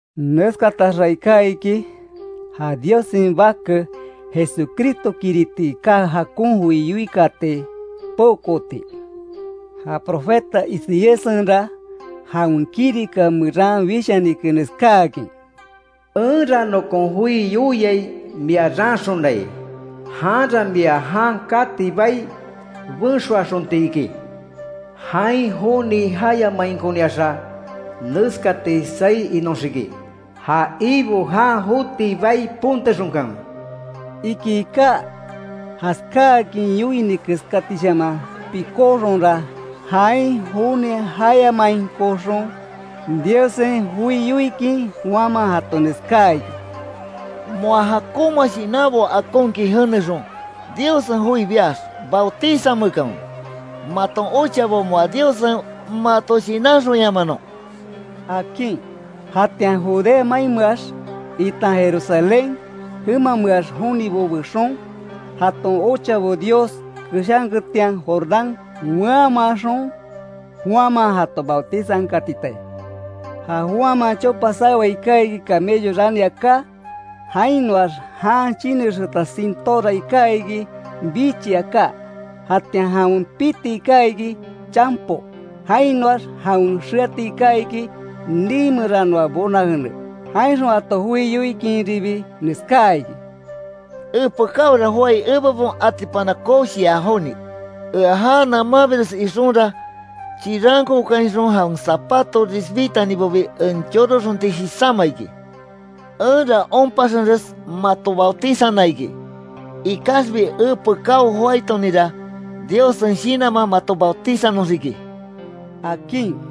Neskataxa iká iki, ja Diossen Bake, Jesucristokiriti iká jakon joi yoikaati peokooti. Ja profeta Isaíassenra, jawen kirika meran wishanike, neskáakin: “Enra nokon joi yoiai mia raanxonai, janra mia jan kati bai benxoaxonti iki. Jain joni jayamainkoniaxa, neskati saí inoxiki: Ja Ibo jan joti bai pontexonkanwe”, iki iká. Jaskáakin yoini keskatishaman pikóxonra, jain joni jayamainkoxon, Diossen joi yoikin Juanman jato neskáa iki: —Moa jakonma shinanbo akonkin jenexon, Diossen joi biax, bautizameekanwe, maton ochabo moa Diossen mato shinanxonyamanon —akin. Jatian Judea mainmeax, itan Jerusalén jemameax jonibo bexon, jaton ochabo Dios keshanketian, Jordán weanmanxon, Juanman jato bautizankatitai. Ja Juanman chopa sawea iká iki, camello rani aká. Jainoax jan chinexeeta sintóra iká iki, bichi aká. Jatian jawen piti iká iki, chanpo, jainoax jawen xeati iká iki, nii meranoa bona jene. Jainxon jato joi yoikinribi, neskáa iki: —Epekáora joái, ebebon atipana koshia joni. Ea já namanbires ixonra, chirankokainxon jawen zapato risbitanibobi en choroxonti jisáma iki. Enra onpaxenres mato bautizana iki. Ikaxbi epekáo joáitoninra, Diossen Shinanman mato bautizanoxiki —akin.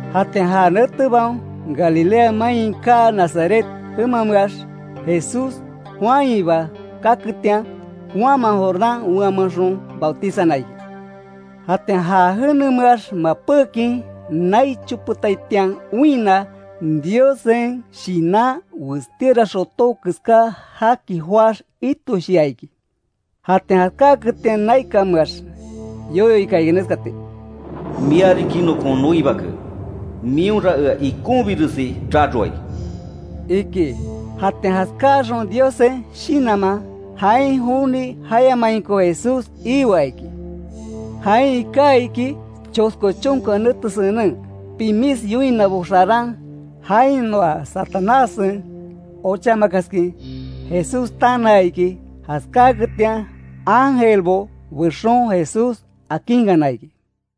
Jatian ja netebaon, Galilea main iká Nazaret jemameax, Jesús Juanhiba kaketian, Juanman Jordán weanmaxon bautizana iki. Jatian ja jenemeax mapékin, nai chopetaitian oinna, Diossen Shinan westíora xotó keska jaki joáx itoshia iki. Jatian jaskáketian, naikanmeax yoyo ika iki neskati: “Mia riki nokon noi Bake, mionra ea ikonbiresi raroai”, iki. Jatian jaskáxon Diossen Shinanman, jain joni jayamainko Jesús ioa iki. Jain iká iki chosko chonka nete senen, pimis yoinabo xaran, jainoa Satanássen ochamakaskin Jesús tanaa iki. Jaskáketian ángelbo bexon Jesús akinkana iki.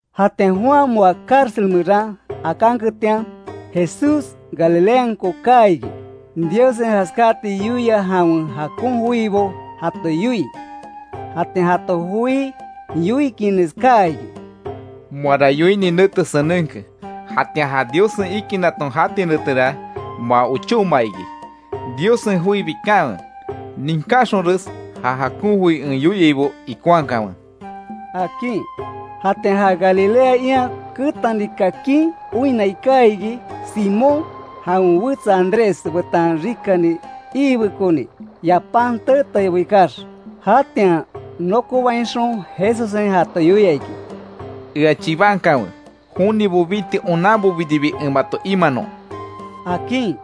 Jatian Juan moa cárcel meran akanketian, Jesús Galileanko kaa iki; Diossen jaskati yoia jawen jakon joibo jato yoii. Jatian jato joi yoikin neskáa iki: “Moara yoini nete senenke. Jatian ja Diossen ikinnaton jati netera, moa ochóma iki, Diossen joi bikanwe. Ninkáxonres ja jakon joi en yoiaibo ikonhakanwe”, akin. Jatian ja Galilea ian ketani kakin, oinna iká iki; Simón jawen wetsa Andrés betan rikani iibekoni, yapán teetaibo ikax. Jatian nokobainxon Jesussen jato yoia iki: —Ea chibankanwe, jonibo biti onanbobiribi en mato imanon —akin.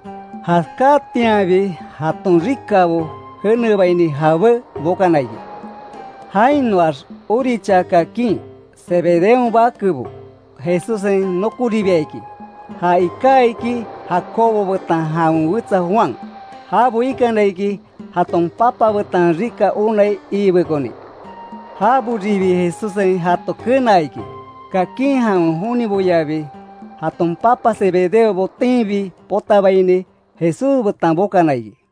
Jaskáatianbi, jaton rikabo jenebaini jabé bokana iki. Jainoax orichaa kakin, Zebedeon bakebo Jesussen nokoribia iki; ja iká iki Jacobo betan jawen wetsa Juan. Jabo ikana iki, jaton papa betan rika onai iibekoni. Jaboribi Jesussen jato kenaa iki. Kakin jawen joniboyabi, jaton papa Zebedeo botenbi potabaini, Jesús betan bokana iki.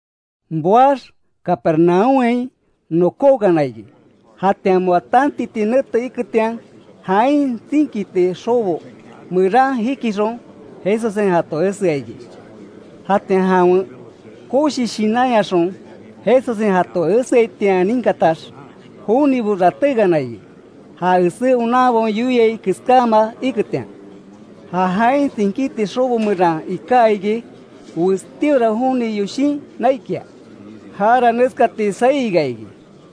Boax Capernaúmhain nokókana iki, jatian moa tantiti nete iketian, jain tsinkiti xobo meran jikixon, Jesussen jato esea iki. Jatian jawen koshi shinanyaxon Jesussen jato eseaitian ninkatax, jonibo ratékana iki; ja esé onanbaon yoiai keskáma iketian. Ja jain tsinkiti xobo meran iká iki, westíora joni yoshin naikia; jara neskati saí ika iki: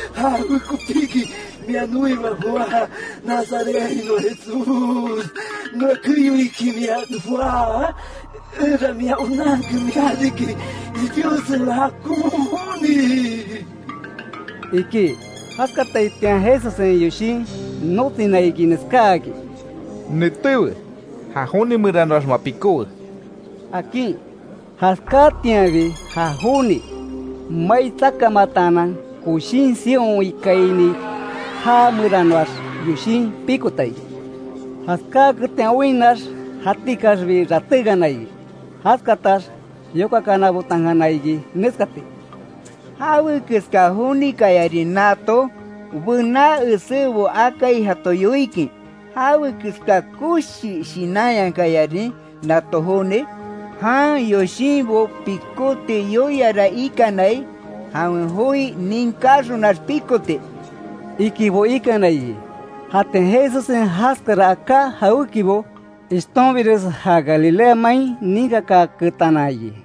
—¿Jawekopiki mia noiba joá Nazarethainoa Jesús? ¿Noa keyoiki mia joá? Enra mia onanke, mia riki Diossen jakon Joni —iki. Jaskataitian Jesussen yoshin notsina iki, neskáakin: —Netéwe, ja joni meranoax moa pikówe —akin. Jaskáatianbi, ja joni, mai tsakamataanan, koshín sion ikaini, já meranoax yoshin pikota iki. Jaskáketian oinnax, jatikaxbi ratékana iki. Jaskatax yokakananbotankana iki, neskati: —¿Jawe keska jonikayarin nato? Bená esébo akai jato yoikin ¿Jawe keska koshi shinanyakayarin nato joni? Jan yoshinbo pikóti yoiara ikanai, jawen joi ninkáxonax, pikoti —ikibo ikana iki. Jatian Jesussen jaskara aká jawékibo, ishtonbires ja Galilea main ninkakaaketana iki.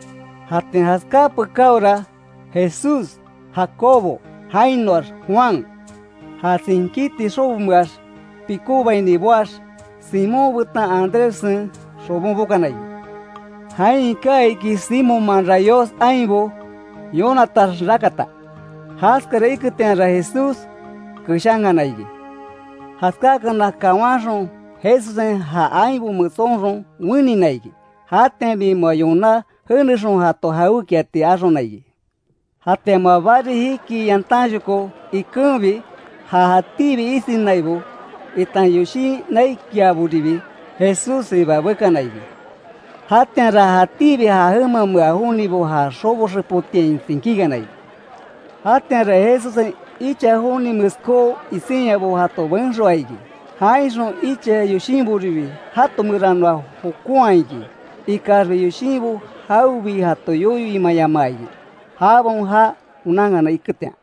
Jatian jaskáa pekáora; Jesús, Jacobo, jainoax Juan, ja tsinkiti xobomeax pikóbaini boax, Simón betan Andréssen xobon bokana iki. Jain iká iki Simonman rayós ainbo yonatax rakata. Jaskara iketianra Jesús keshankana iki. Jaskáakana kawanxon, Jesussen ja ainbo metsonxon wenina iki. Jatianbi moa yoná jenexon jato jawékiati axona iki. Jatian moa bari jikii yantanshoko ikenbi, ja jatíbi isinaibo, itan yoshin naikiaboribi, Jesússiba bekana iki. Jatianra jatíbi ja jemamea jonibo ja xobo xepotiain tsinkíkana iki. Jatianra Jesussen icha joni meskó isinyabo jato benxoaa iki. Jainxon icha yoshinboribi jato meranoa jokonhaa iki. Ikaxbi yoshinbo jawebi jato yoyo imayamaa iki, jabaon já onankana iketian.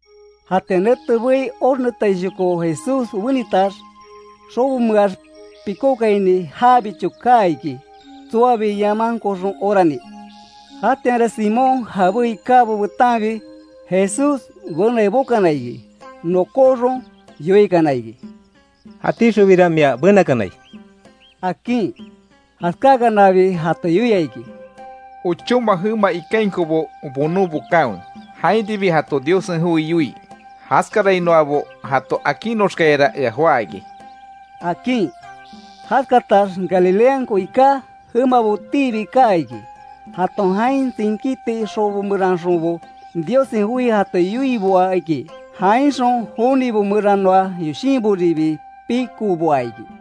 Jatian nete bei, oxnetaishoko Jesús wenitax, xobomeax pikókaini jabicho kaa iki, tsoabi yamankoxon orani. Jatianra Simón jabé ikábo betanbi, Jesús benai bokana iki. Nokóxon yoikana iki: —Jatíxonbira mia benakanai —akin. Jaskáakanabi jato yoia iki: —Ochóma jema ikainkobo bonon bokanwe, jainribi jato Diossen joi yoii. Jaskarainoabo jato akinoxkayara ea joá iki —akin. Jaskatax Galileanko iká jemabotiibi kaa iki. Jaton jain tsinkiti xobo meranxonbo, Diossen joi jato yoiboa iki. Jainxon jonibo meranoa yoshinboribi pikoboa iki.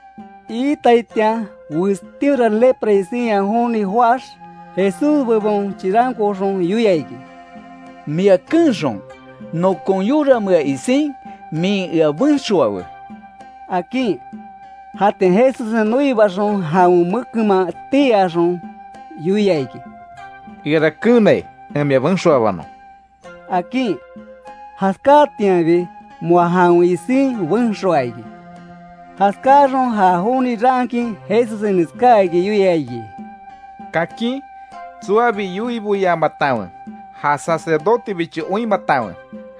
Iitaitian, westíora lepra isinya joni joáx, Jesús bebon chirankooxon yoia iki: —Mia keenxon, nokon yoramea isin, min ea benxoawe —akin. Jatian Jesussen noibaxon, jawen mekenman tii axon, yoia iki: —Eara keenai, en mia benxoabanon —akin. Jaskáatianbi, moa jawen isin benxoaa iki. Jaskáaxon, ja joni raankin, Jesussen neskáakin yoia iki: —Kakin, tsoabi yoiboyamatanwe, ja sacerdotebicho oinmatanwe.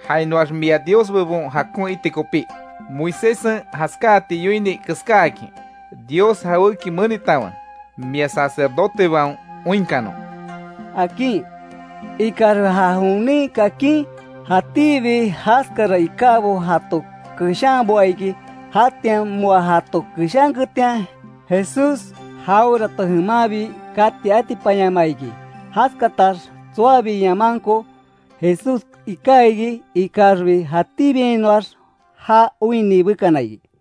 Jainoax mia Dios bebon jakon iti kopí, Moiséssen jaskáati yoini keskáakin, Dios jawéki menitanwe, mia sacerdotebaon oinkanon —akin. Ikaxbi ja jonin kakin, jatíbi jaskara ikábo jato keshanboa iki. Jatian moa jato keshanketian, Jesús jawerato jemanbi kati atipanyamaa iki. Jaskatax tsoabi yamanko, Jesús iká iki; ikaxbi, jatíbiainoax já oinni bekana iki.